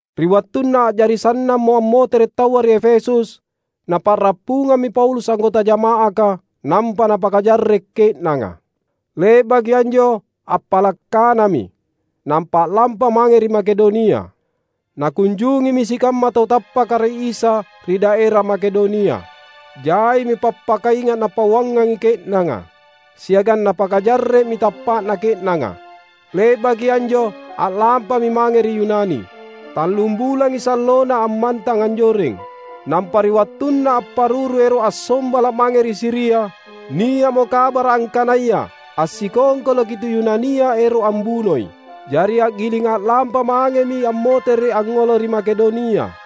Ri wattunna a’jari sannammo ammotere’ taua ri Efesus, napa’rappungammi Paulus anggota jama’aka nampa napakajarre’ ke’nanga. Le’baki anjo appala’ kanami, nampa a’lampa mange ri Makedonia. Nakunjungimi sikamma tau tappaka ri Isa ri daera Makedonia. Jaimi pappakainga’ napauangi ke’nanga, siagang napakajarre’mi tappa’na ke’nanga. Le’baki anjo a’lampami mange ri Yunani. Tallum bulangi sallona ammantang anjoreng. Nampa ri wattunna apparuru ero’ assombala’ mange ri Siria, nia’mo kabara’ angkanaya assikongkoloki tu Yunania ero’ ambunoi. Jari a’giling a’lampa mangemi ammotere’ angngolo ri Makedonia.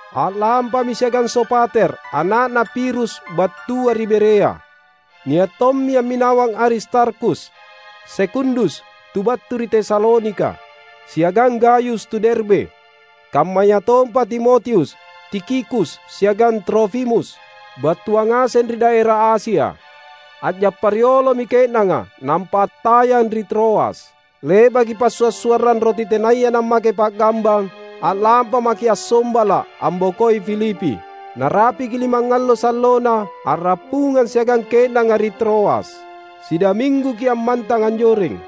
A’lampami siagang Sopater, ana’na Pirus battua ri Berea; nia’ tommi amminawang Aristarkhus, Sekundus tu battu ri Tesalonika, siagang Gayus, tu Derbe. Kammayatompa Timotius, Tikhikus siagang Trofimus, battua ngaseng ri daera Asia. A’jappa riolomi ke’nanga, nampa attayang ri Troas. Le’baki Passua’-suarrang Roti Tenaya Nammake Pa’gambang, a’lampa maki’ assombala’, ambokoi Filipi. Narapiki limangallo sallona, a’rappungang siagang ke’nanga ri Troas. Sidamingguki’ ammantang anjoreng.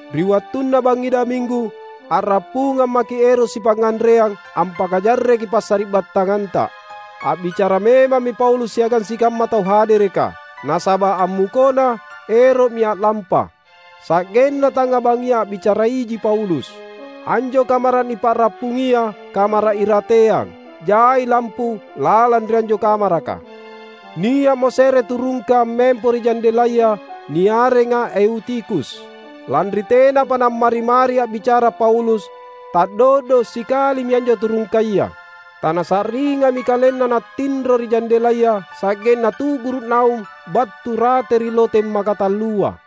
Ri wattunna bangngi daminggu a’rappungang maki’ ero’ sipangnganreang ampakajarreki passari’battanganta. A’bicara memammi Paulus siagang sikamma tau hadereka, nasaba’ ammukona ero’mi a’lampa. Sa’genna tangnga bangngi a’bicara iji Paulus. Anjo kamara’ nipa’rappungia kamara’ irateang. Jai lampu lalang ri anjo kamaraka. Nia’mo se’re turungka ammempo ri jandelaya niarenga Eutikhus. Lanri tenapa nammari-mari a’bicara Paulus, ta’do’do’ sikalimi anjo turungkaya. Tanasa’ringami kalenna nattinro ri jandelaya sa’genna tu’guru’ naung battu rate ri loteng makatallua.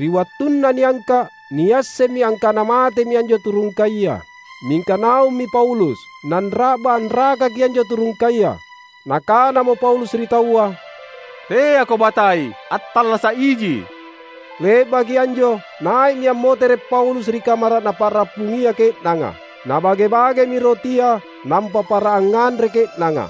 Ri wattunna niangka’, niassemmi angkana matemi anjo turungkaya. Mingka naummi Paulus, nanra’ba anrakaki anjo turungkaya. Nakanamo Paulus ri taua, "Teako batai, attallasa’ iji!" Le’baki anjo nai’mi ammotere’ Paulus ri kamara’ napa’rappungia ke’nanga. Nabage-bagemi rotia nampa para angnganre ke’nanga.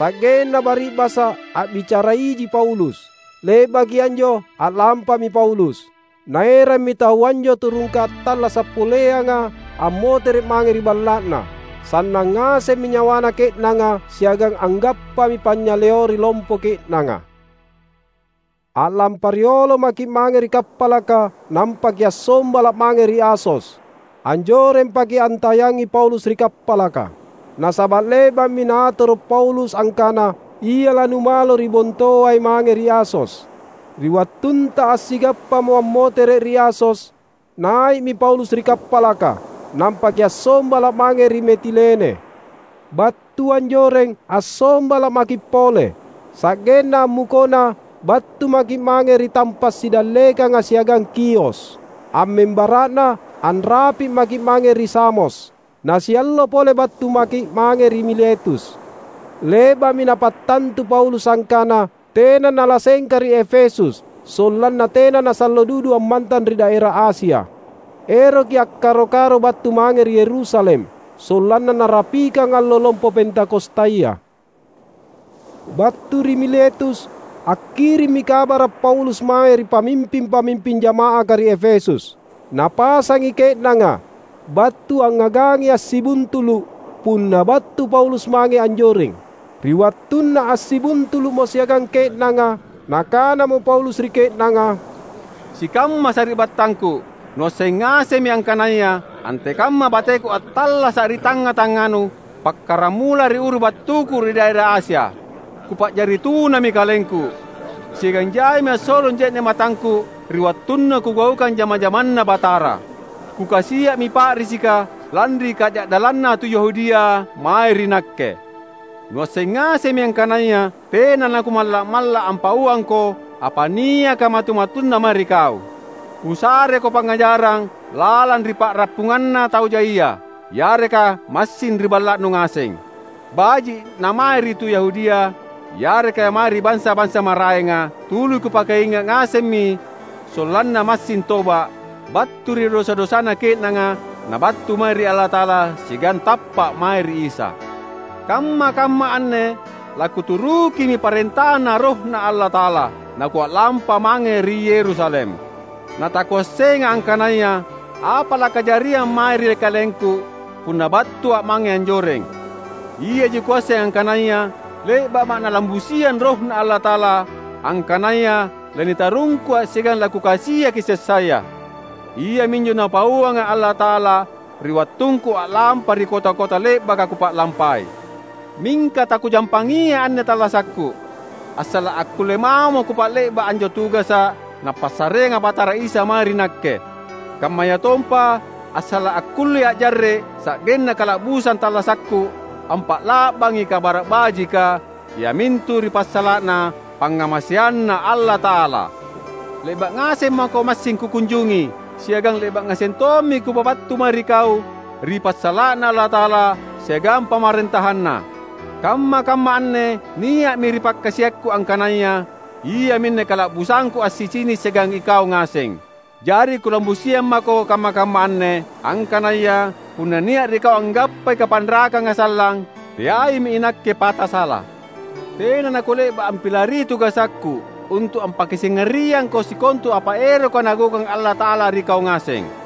Sa’genna bari’basa’ a’bicara iji Paulus. Le’baki anjo a’lampami Paulus. Naerammi taua anjo turungka attallasa’ poleanga ammotere’ mange ri balla’na. Sannang ngasemmi nyawana ke’nanga siagang anggappami panynyaleori lompo ke’nanga. A’lampa riolo maki’ mange ri kappalaka nampa kiassombala’ mange ri Asos. Anjorempaki’ antayangi Paulus ri kappalaka. Nasaba’ le’ba’mi naatoro’ Paulus angkana ia lanumalo ri bontoai mange ri Asos. Ri wattunta assigappamo ammotere’ ri Asos, nai’mi Paulus ri kappalaka, nampa kiassombala’ mange ri Metilene. Battu anjoreng assombala’ maki’ pole, sa’genna ammukona battu maki’ mange ri tampa’ sidallekanga siagang Khios. Ammembara’na anrapi’ maki’ mange ri Samos. Nasiallo pole battu maki’ mange ri Miletus. Le’ba’mi napattantu Paulus angkana tena nalassengka ri Efesus sollanna tena nasallo dudu ammantang ri daera Asia. Eroki akkaro-karo battu mange ri Yerusalem sollanna narapikang allo lompo Pentakostaya. Battu ri Miletus, akkirimmi kabara’ Paulus mae ri pamimping-pamimping jama’aka ri Efesus. Napasangi ke’nanga battu angngagangi assibuntulu’ punna battu Paulus mange anjoreng. Ri wattunna assibuntulu’mo siagang ke’nanga, nakanamo Paulus ri ke’nanga, "Sikamma sari’battangku; nuasseng ngasemmi angkanaya antekamma bateku attallasa’ ri tangnga-tangnganu pakkaramula ri uru battuku ri daera Asia. Kupa’jari tunami kalengku, siagang jaimi assolong je’ne’ matangku ri wattunna kugaukang jama-jamanNa Batara. Kukasia’mi pa’risika lanri kaja’dallanna tu Yahudia mae ri nakke. Nuasseng ngasemmi angkanaya tena nakumalla’-malla’ ampauangko apa niaka matu-matunna mae ri kau. Kusareko pangngajarang lalang ri pa’rappunganna tau jaia, yareka massing ri balla’nu ngaseng. Baji’ namae ri tu Yahudia, yareka mae ri bansa-bansa maraenga, tuli kupakainga’ ngasemmi sollanna massing toba’, battu ri dosa-dosana ke’nanga nabattu mae ri Allata’ala siagang tappa’ mae ri Isa. Kamma-kamma anne lakuturukimi parentaNa RohNa Allata’ala, nakua’lampa mange ri Yerusalem. Na takuassenga angkanaya apa lakajariang mae ri kalengku punna battua’ mange anjoreng. Iaji kuasseng angkanaya le’ba’ma’ Nalambusiang RohNa Allata’ala angkanaya lanitarungkua’ siagang lakukasiaki sessaya. Iaminjo Napauanga’ Allata’ala ri wattungku a’lampa ri kota-kota le’baka kupa’lampai. Mingka takujampangiai anne tallasakku, assala’ akkulle mamo kupa’le’ba’ anjo tugasa’ Napassareanga Batara Isa mae ri nakke; kammayatompa assala’ akkullea’ jarre’ sa’genna kala’busang tallasakku ampa’la’bangi Kabara’ Bajika, iamintu ri passala’na pangngamaseanNa Allata’ala. Le’ba’ ngaseng mako massing kukunjungi, siagang le’ba’ ngaseng tommi kupabattu mae ri kau ri passala’na Allata’ala siagang PamarentahanNa. Kamma-kamma anne nia’mi ri pakkasiakku angkanaya iaminne kala’busangku assicini’ siagang ikau ngaseng. Jari kulambusiang mako kamma-kamma anne, angkanaya punna nia’ ri kau anggappai kapanrakanga sallang, teaimi inakke pata sala. Tena nakule’ba’ ampilari tugasakku untu’ ampakasingariangko sikontu apa eroka Nagaukang Allata’ala ri kau ngaseng.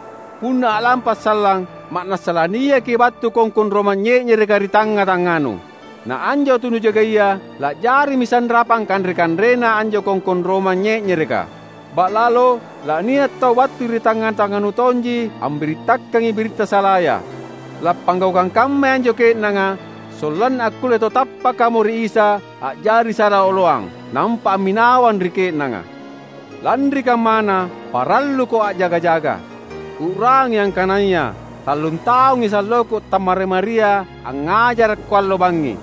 Punna a’lampa’ sallang, ma’nassa laniaki battu kongkong romang nye’nyereka ri tangnga-tangnganu. Na anjo tau nujagaia la’jarimi sanrapang kanre-kanrena anjo kongkong romang nye’nyereka. Ba’lalo lania’ tau battu ri tangnga-tangnganu tonji ambirittakangi biritta salaya. Lappanggaukang kammai anjo ke’nanga sollanna akkulle tau tappakamo ri Isa a’jari sala oloang, nampa amminawang ri ke’nanga. Lanri kammana, paralluko a’jaga-jaga! U’rangi angkanaya tallun taungi salloku tammari-maria angngajarakko allo bangngi,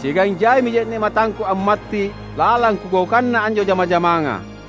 siagang jaimi je’ne’ matangku ammatti’ lalang kugaukanna anjo jama-jamanga.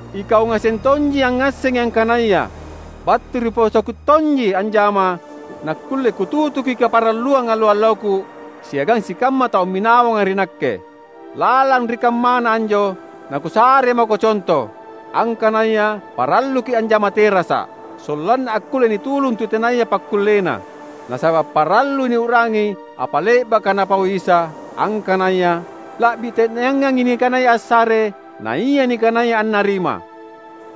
Ikau ngaseng tonji angngassengi angkanaya battu ri posoku tonji anjama nakkulle kututuki kaparalluang allo-alloku siagang sikamma tau amminawang ri nakke. Lalang ri kammana anjo, nakusare mako conto, angkanaya paralluki’ anjama terasa’, sollanna akkulle nitulung tu tenaya pakkullena. Nasaba’ parallui niu’rangi apa le’baka Napau Isa, angkanaya, ‘La’bi te’neangangi nikanaya assare naia nikanaya annarima.’"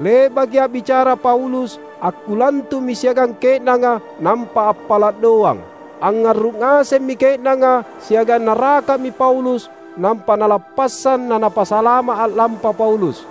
Le’baki a’bicara Paulus, akkulantu’mi siagang ke’nanga nampa appala’ doang. Angngarru’ ngasemmi ke’nanga siagang naraka’mi Paulus nampa nalappassang na napasalama’ a’lampa Paulus.